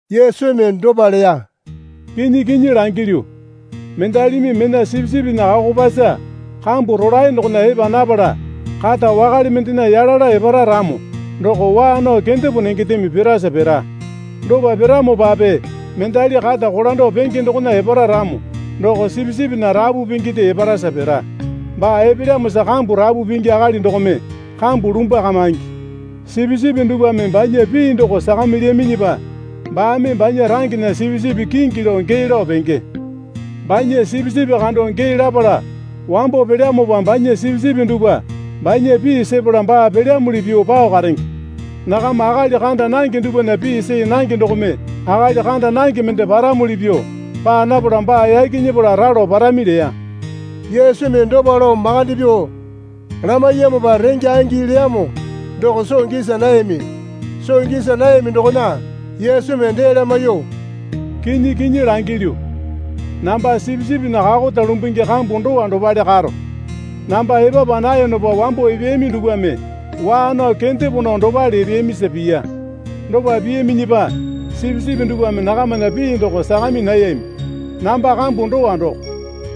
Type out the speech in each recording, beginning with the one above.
Yesumi dopa leya. Kinyi kinyi langilyu, mendalimi mena sipisipinya kakopasa kambu rolae dokona epa napala kata wakale mendena yalala epara ramo doko waa nao kendepo nengendeme pirasa pira. Dopa piramopape mendali kata kolando penge dokona epara ramo doko sipisipinya rapu pinginde eparasa pira. Baa epelyamosa kambu rapu pingi akali dokome kambu lumbwakamaingi. Sipisipi dupwame banya pii doko sakamilyaminyipa baame banya rangena sipisipi kingi lao gee lao penge. Banya sipisipi kando gee lapala wambo pelyamopa banya sipisipi dupwa banya pii sepala baa pelyamuli pyuo pao karenge. Nakama akali kanda nange dupwana pii see nange dokome akali kanda nange mende paramuli pyuo paa napala baa yaki nyepala ralo parami leya. Yesumi dopa lao makande pyuo lamaiyamopa renge angi leyamo doko soo gisa nayami. Soo gisa nayami dokona Yesumi dee lamaiyuo, Kinyi kinyi langilyu, namba sipisipinya kakota lumbungi kambu dowa dopale karo. Namba epapa nayonopa wambo epeyami dupwame waa nao kendepo nao dopale epeyamisa piya. Dopa piyaminyipa sipisipi dupwame nakamana pii doko sakami nayami. Namba kambu dowa doko.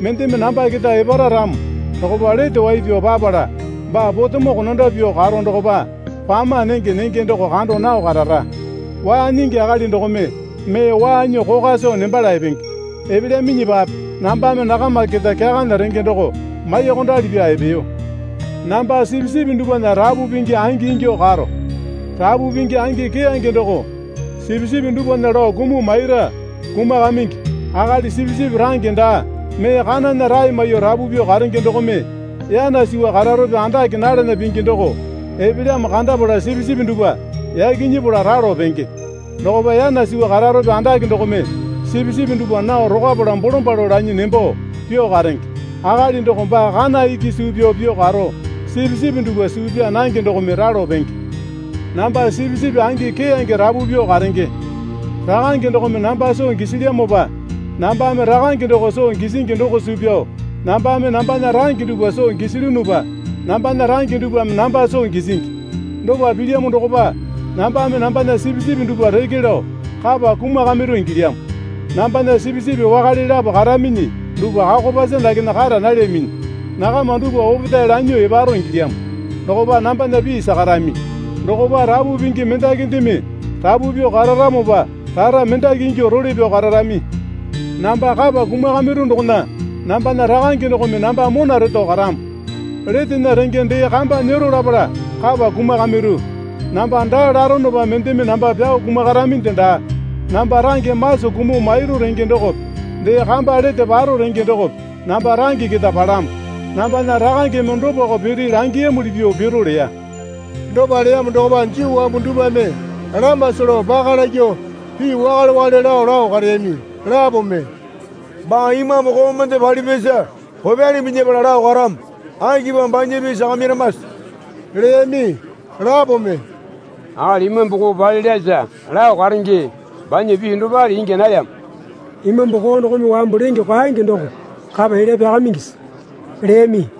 Mendeme namba keta epara ramo dokopa lete wai pyao papala baa potemo konando pyuo karo dokopa pama nenge nenge doko kando nao karara. Waa nyingi akali dokome mee waa nyuo kokwa soo nembala epenge. Epelyaminyipape nambame nakama keta kyakana renge doko maiyuokondali pyaa epeyo. Namba sipisipi dupwana rapu pingi angingyuo karo. Rapu pingi angi keyange doko sipisipi dupwana lao kumuo maira, kumakamingi. Akali sipisipi range daa mee kanana rae maiyuo rapu pyuo karenge dokome yana suwa kararope andake nalana pingi doko epelyamo kandapala sipisipi dupwa yaki nyepala ralo penge. Dokopa yana suwa kararope andake dokome sipisipi dupwa nao rokwapala bolombalo lanyi nembo pyuo karenge. Akali doko baa kana iki suu pyao pyuo karo sipisipi dupwa suu pyaa nange dokome ralo penge. Namba sipisipi angi keyange rapu pyuo karenge. Rakange dokome namba soo gisilyamopa nambame Rakange doko soo gisingi doko suu pyao nambame nambana range dupwa soo gisilyunupa nambana range dupwame namba soo gisingi. Dopa pilyamo dokopa nambame nambana sipisipi dupwa reke lao kapa kumakamairu ingilyamo. Nambana sipisipi wakale lapo karaminyi dupwa kakopasa dakena kara nalyaminyi. Nakama dupwa opetae lanyuo eparo ingilyamo. Dokopa nambana pii sakarami. Dokopa rapu pingi mendakindeme rapu pyuo kararamopa rara mendaki ingyuo role pyao kararami. Namba kapa kumakamairu dokona nambana Rakange dokome namba mona reto karamo. Letena renge dee kamba nyero lapala kapa kumakamairu. Namba daa laronopa mendeme namba pyao kumakaraminde daa. Namba range maso kumuo mairu renge dokope dee kamba lete paro renge dokope namba range keta palamo. Nambana Rakangeme dopako piri langiyamuli pyuo piro leya. Dopa leyamo dokopa Juu wambu dupwame lamasa lao paka lakyuo pii wakale wakale lao lao kareyami. Lapome, Baa imambu koo mende palipyasa kopyali minyapala lao karamo. Akipamo banya pii sakamairamase? leyami. Lapome, Akali imambu koo palelyasa lao karenge banya pii dopale ingya nalyamo. Imambu koo dokome wambu lenge kwaenge doko kapa elya pyakamaingisi? leyami.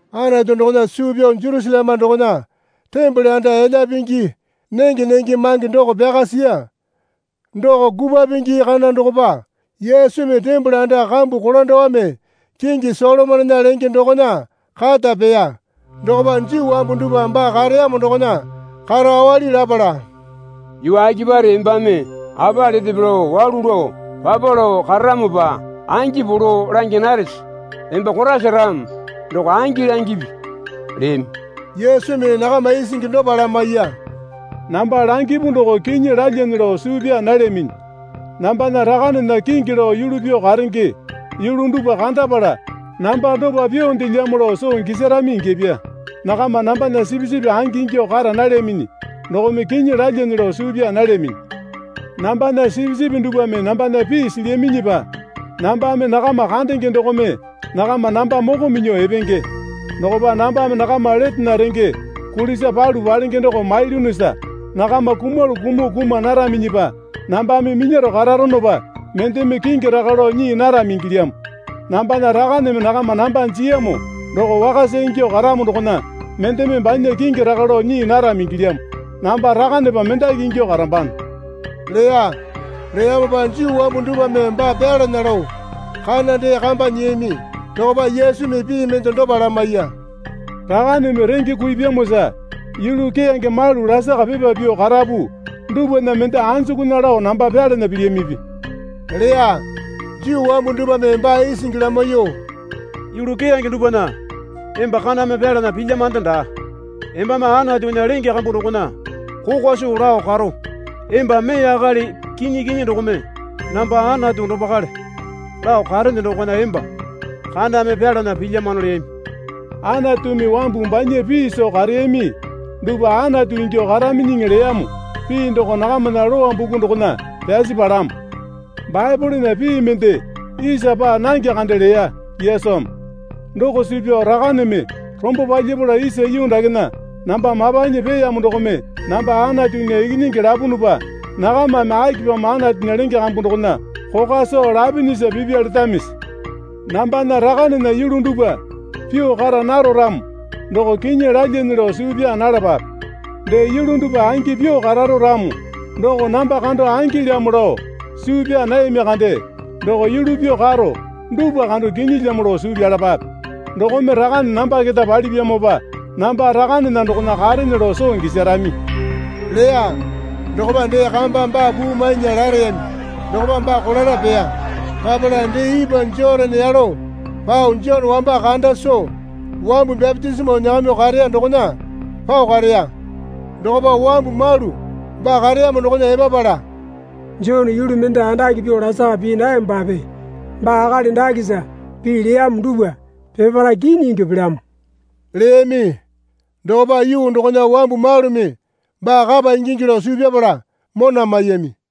Anatu dokona suu pyao Jerusaleme dokona tembole anda elya pingi nenge nenge mange doko pyaka siya. Doko kupwa pingi kana dokopa Yesumi tembole anda kambu kolandowame kingi Solomonena lenge dokona kata peya. Dokopa Juu wambu dupwa baa kareyamo dokona karo awali lapala, Yuu akipare embame apa letepe lao walu lao papa lao kararamopa angi polo langya narese? Emba Koraisa ramo doko angi langipi, leyami. Yesumi nakama isingi dopa lamaiya. Namba langipu doko kinyi lalyane lao suu pyaa nalyaminyi. Nambana Rakanena kingi lao yulu pyuo karenge yulu dupwa kandapala namba dopa pyuondelyamo lao soo gisarami ingyapya. Nakama nambana sipisipi angi ingyuo kara nalyaminyi dokome kinyi lalyane lao suu pyaa nalyaminyi. Nambana sipisipi dupwame nambana pii silyaminyipa nambame nakama kandenge dokome nakama namba moko minyuo epenge. Dokopa nambame nakama letena renge kulisa palu palenge doko mailyunusa nakama kumalu kumuo kuma naraminyipa nambame minyaro kararonopa mendeme kingi raka lao nyii narami ingilyamo. Nambana Rakaneme nakama namba jiyamo doko wakasa ingyuo karamo dokona mendeme banya kingi raka lao nyii narami ingilyamo. Namba Rakanepa mendaki ingyuo karambano leya. Leyamopa Juu wambu dupwame baa pyalana lao kana dee kamba nyiyami. Dokopa Yesumi pii mende dopa lamaiya. Rakaneme renge kuipyamosa yulu keyange malu lasaka pipa pyuo karapu dupwana mende anjukunya lao namba pyalana pilyamipi? leya. Juu wambu dupwame baa isingi lamaiyuo, Yulu keyange dupwana emba kaname pyalana pilyamande daa. Embame Anatunya lenge kambu dokona kokwa soo lao karo emba mee akali kinyi kinyi dokome, Namba Anatu dopakale lao karene dokona emba kaname pyalana pilyamano leyami. Anatumi wambu banya pii soo kareyami dupwa Anatu ingyuo karaminyiŋi leyamo pii doko nakamana Lowa buku dokona pyasi palamo. Baepolena pii mende isa paa nange kande leya Yesumi. Doko suu pyao Rakaneme rombo palyapala isa yuu dakena namba mapanyi peeyamo dokome namba Anatunya Ikinyingi lapunupa nakamana akipamo Anatunya lenge kambu dokona kokwa soo lapinyisa pipya letamisi? Nambana Rakanena yulu dupwa pyuo kara naro ramo doko kinyi lalyane lao suu pyaa nalapape. Dee yulu dupwa angi pyuo kararo ramo doko namba kando angilamo lao suu pyaa nayami kande doko yulu pyuo karo dupwa kando kinyilamo lao suu pyalapape. Dokome Rakane namba keta palipyamopa namba Rakanena dokona karene lao soo gisarami leya. Dokopa dee kamba baa puu mainya lareyami dokopa baa kolala peya. Papala dee ipwa Jotane yalo pao Jone wamba kanda soo wambu bapitisimo nyakamyuo kareya dokona pao kareya. Dokopa wambu malu baa kareyamo dokona epapala, Jone yulu mende andake pyuo lasaka pii nayamopape baa akali dakesa pii leyamo dupwa peparae kinyi ingyuo pelyamo, leyami. Dokopa yuu dokona wambu malumi baa kapa ingingi lao suu pyapala mona maiyami.